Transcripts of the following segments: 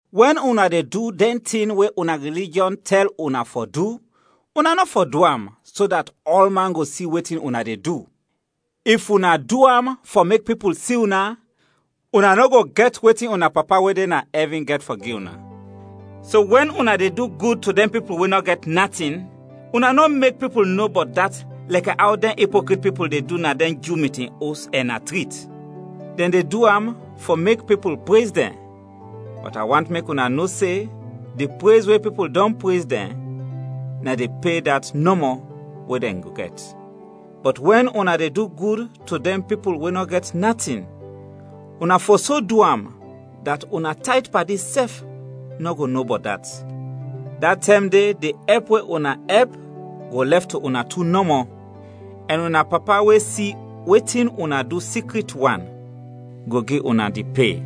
“Wɛn una de du dɛn tin we una rilijɔn tɛl una fɔ du, una nɔ fɔ du am, so dat ɔlman go si wetin una de du. If una du am fɔ mek pipul si una, una nɔ go gɛt wetin una Papa we de na ɛvin gɛt fɔ gi una. “So wɛn una de du gud to dɛn pipul we nɔ gɛt natin, una nɔ mek pipul no bɔt dat lɛkɛ aw dɛn ipokrit pipul de du na dɛn Ju mitin os ɛn na trit. Dɛn de du am fɔ mek pipul prez dɛn, bɔt a want mek una no se di prez we pipul dɔn prez dɛn na di pe dat nɔmɔ we dɛn go gɛt. Bɔt wɛn una de du gud to dɛn pipul we nɔ gɛt natin, una fɔ so du am, dat una tayt padi sɛf nɔ go no bɔt dat. Da tɛm de di ɛp we una ɛp go lɛf to una tu nɔmɔ, ɛn una Papa we si wetin una du sikrit wan, go gi una di pe.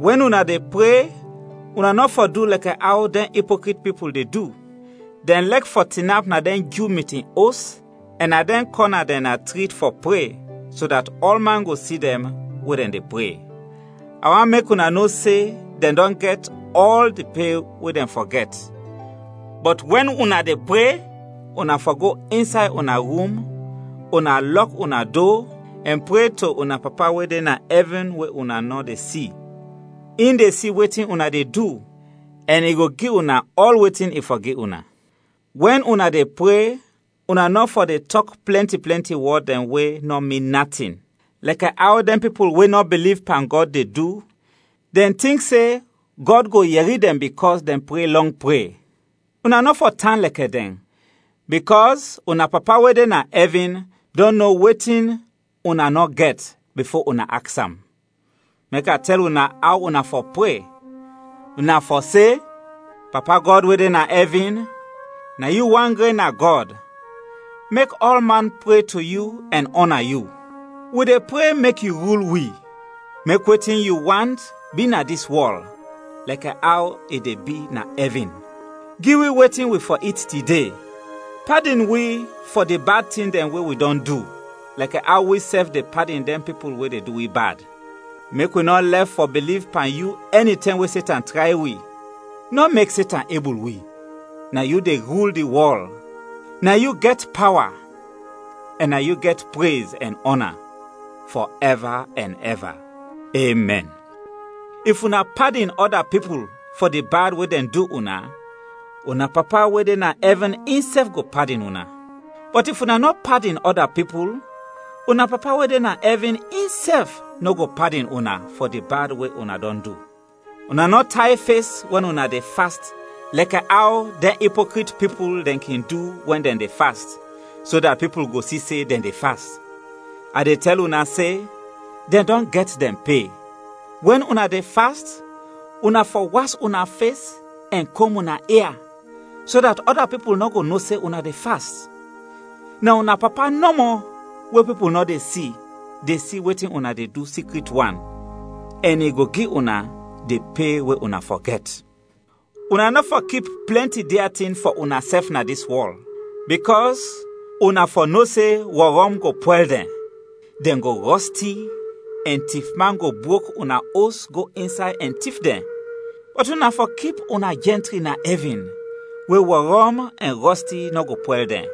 “Wɛn una de pre, una nɔ fɔ du lɛkɛ aw dɛn ipokrit pipul de du. Dɛn lɛk fɔ tinap na dɛn Ju mitin os, ɛn na dɛn kɔna dɛn na trit fɔ pre, so dat ɔlman go si dɛn we dɛn de pre. A want mek una no se, dɛn dɔn gɛt ɔl di pe we dɛn fɔ gɛt. Bɔt wɛn una de pre, una fɔ go insay una rum, una lɔk una do, ɛn pre to una Papa we de na ɛvin we una nɔ de si. In de si wetin una de du, ɛn i go gi una ɔl wetin i fɔ gi una. “Wɛn una de pre, una nɔ fɔ de tɔk plɛnti plɛnti wɔd dɛn we nɔ min natin, lɛkɛ aw dɛn pipul we nɔ biliv pan Gɔd de du, dɛn tink se Gɔd go yɛri dɛn bikɔs dɛn pre lɔng pre. Una nɔ fɔ tan lɛkɛ dɛn, bikɔs una Papa we de na ɛvin dɔn no wetin una nɔ gɛt bifo una aks am. Mek a tɛl una aw una fɔ pre, una fɔ se: ‘Papa Gɔd we de na ɛvin: Na yu wan gren na Gɔd, mek ɔlman pre to yu ɛn ɔna yu; Wi de pre mek yu rul wi; mek wetin yu want, bi na dis wɔl, lɛkɛ aw i de bi na ɛvin. Gi wi wetin wi fɔ it tide. Padin wi fɔ di bad tin dɛn we wi dɔn du, lɛkɛ aw wisɛf de padin dɛn pipul we de du wi bad. Mek wi nɔ lɛf fɔ biliv pan yu ɛnitɛm we Setan tray wi; nɔ mek Setan ebul wi. [Na yu de rul di wɔl, na yu gɛt pawa, ɛn na yu gɛt prez ɛn ɔna, fɔ ɛva ɛn ɛva. Emɛn.’] “If una padin ɔda pipul fɔ di bad we dɛn du una, una Papa we de na ɛvin insɛf go padin una. Bɔt if una nɔ padin ɔda pipul, una Papa we de na ɛvin insɛf nɔ go padin una fɔ di bad we una dɔn du. “Una nɔ tay fes wɛn una de fast lɛkɛ aw dɛn ipokrit pipul dɛn kin du wɛn dɛn de fast, so dat pipul go si se dɛn de fast. A de tɛl una se; dɛn dɔn gɛt dɛn pe. Wɛn una de fast, una fɔ was una fes ɛn kom una ia, so dat ɔda pipul nɔ go no se una de fast. Na una Papa nɔmɔ, we pipul nɔ de si, de si wetin una de du sikrit wan, ɛn i go gi una di pe we una fɔ gɛt. “Una nɔ fɔ kip plɛnti dia tin fɔ unasɛf na dis wɔl, bikɔs una fɔ no se wɔrɔm go pwɛl dɛn, dɛn go rɔsti ɛn tifman go brok una os go insay ɛn tif dɛn. Bɔt una fɔ kip una jɛntri na ɛvin, we wɔrɔm ɛn rɔsti nɔ go pwɛl dɛn,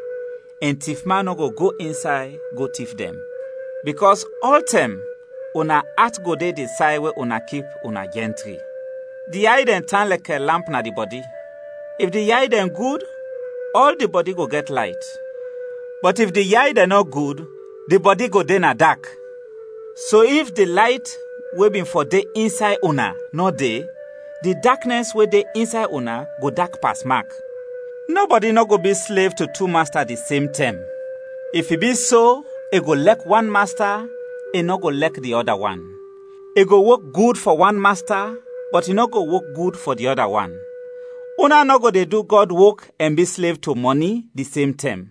ɛn tifman nɔ go go insay go tif dɛn. Bikɔs ɔltɛm una at go de di say we una kip una jɛntri. “Di yay dɛn tan lɛkɛ lamp na di bɔdi. If di yay dɛn gud, ɔl di bɔdi go gɛt layt; bɔt if di yay dɛn nɔ gud, di bɔdi go de na dak. So if di layt we bin fɔ de insay una, nɔ de, di daknɛs we de insay una go dak pasmak. “Nɔbɔdi nɔ go bi slev to tu masta di sem tɛm. If i bi so, i go lɛk wan masta, i nɔ go lɛk di ɔda wan. I go wok gud fɔ wan masta, bɔt i nɔ go wok gud fɔ di ɔda wan. Una nɔ go de du Gɔd wok ɛn bi slev to mɔni, di sem tɛm.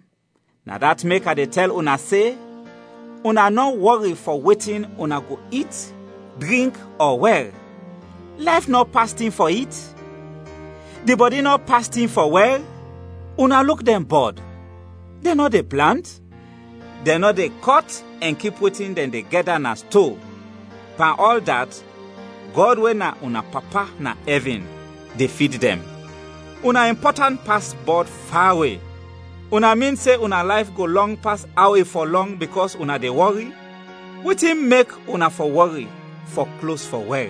“Na dat mek a de tɛl una se: una nɔ wɔri fɔ wetin una go it, drink, ɔ wɛr. Layf nɔ pas tin fɔ it? Di bɔdi nɔ pas tin fɔ wɛr? Una luk dɛn bɔd, dɛn nɔ de plant, dɛn nɔ de kɔt ɛn kip wetin dɛn de gɛda na sto; pan ɔl dat, Gɔd we na una Papa na ɛvin de fid dɛn. Una impɔtant pas bɔd fawe! Una min se una layf go lɔng pas aw i fɔ lɔng, bikɔs una de wɔri? “Wetin mek una fɔ wɔri fɔ klos fɔ wɛr?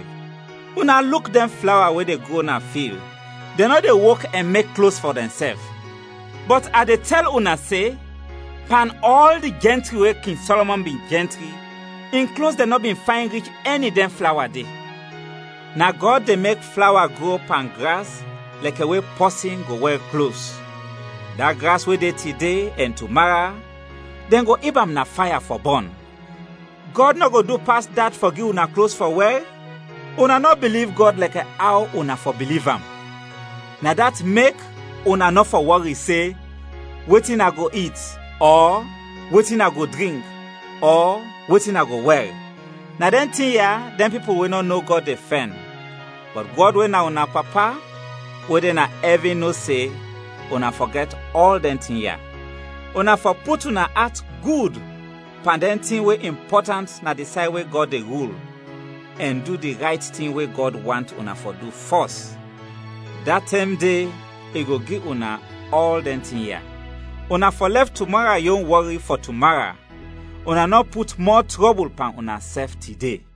Una luk dɛn flawa we de gro na fil, dɛn nɔ de wok ɛn mek klos fɔ dɛnsɛf; bɔt a de tɛl una se, pan ɔl di jɛntri we King Sɔlɔmɔn bin jɛntri, in klos dɛn nɔ bin fayn rich ɛni dɛn flawa de. Na Gɔd de mek flawa gro pan gras lɛkɛ we pɔsin go wɛr klos, da gras we de tide, ɛn tumara, dɛn go ib am na faya fɔ bɔn. Gɔd nɔ go du pas dat fɔ gi una klos fɔ wɛr? Una nɔ biliv Gɔd lɛkɛ aw una fɔ biliv am! “Na dat mek una nɔ fɔ wɔri se, ‘Wetin a go it?’ ɔ ‘Wetin a go drink?’ ɔ ‘Wetin a go wɛr?’ Na dɛn tin ya dɛn pipul we nɔ no Gɔd de fɛn, bɔt Gɔd we na una Papa we de na ɛvin no se una fɔ gɛt ɔl dɛn tin ya. Una fɔ put una at gud pan dɛn tin we impɔtant na di say we Gɔd de rul ɛn du di rayt tin we Gɔd want una fɔ du fɔs, da tɛm de i go gi una ɔl dɛn tin ya. Una fɔ lɛf tumara yon wɔri fɔ tumara; una nɔ put mɔ trɔbul pan unasɛf tide.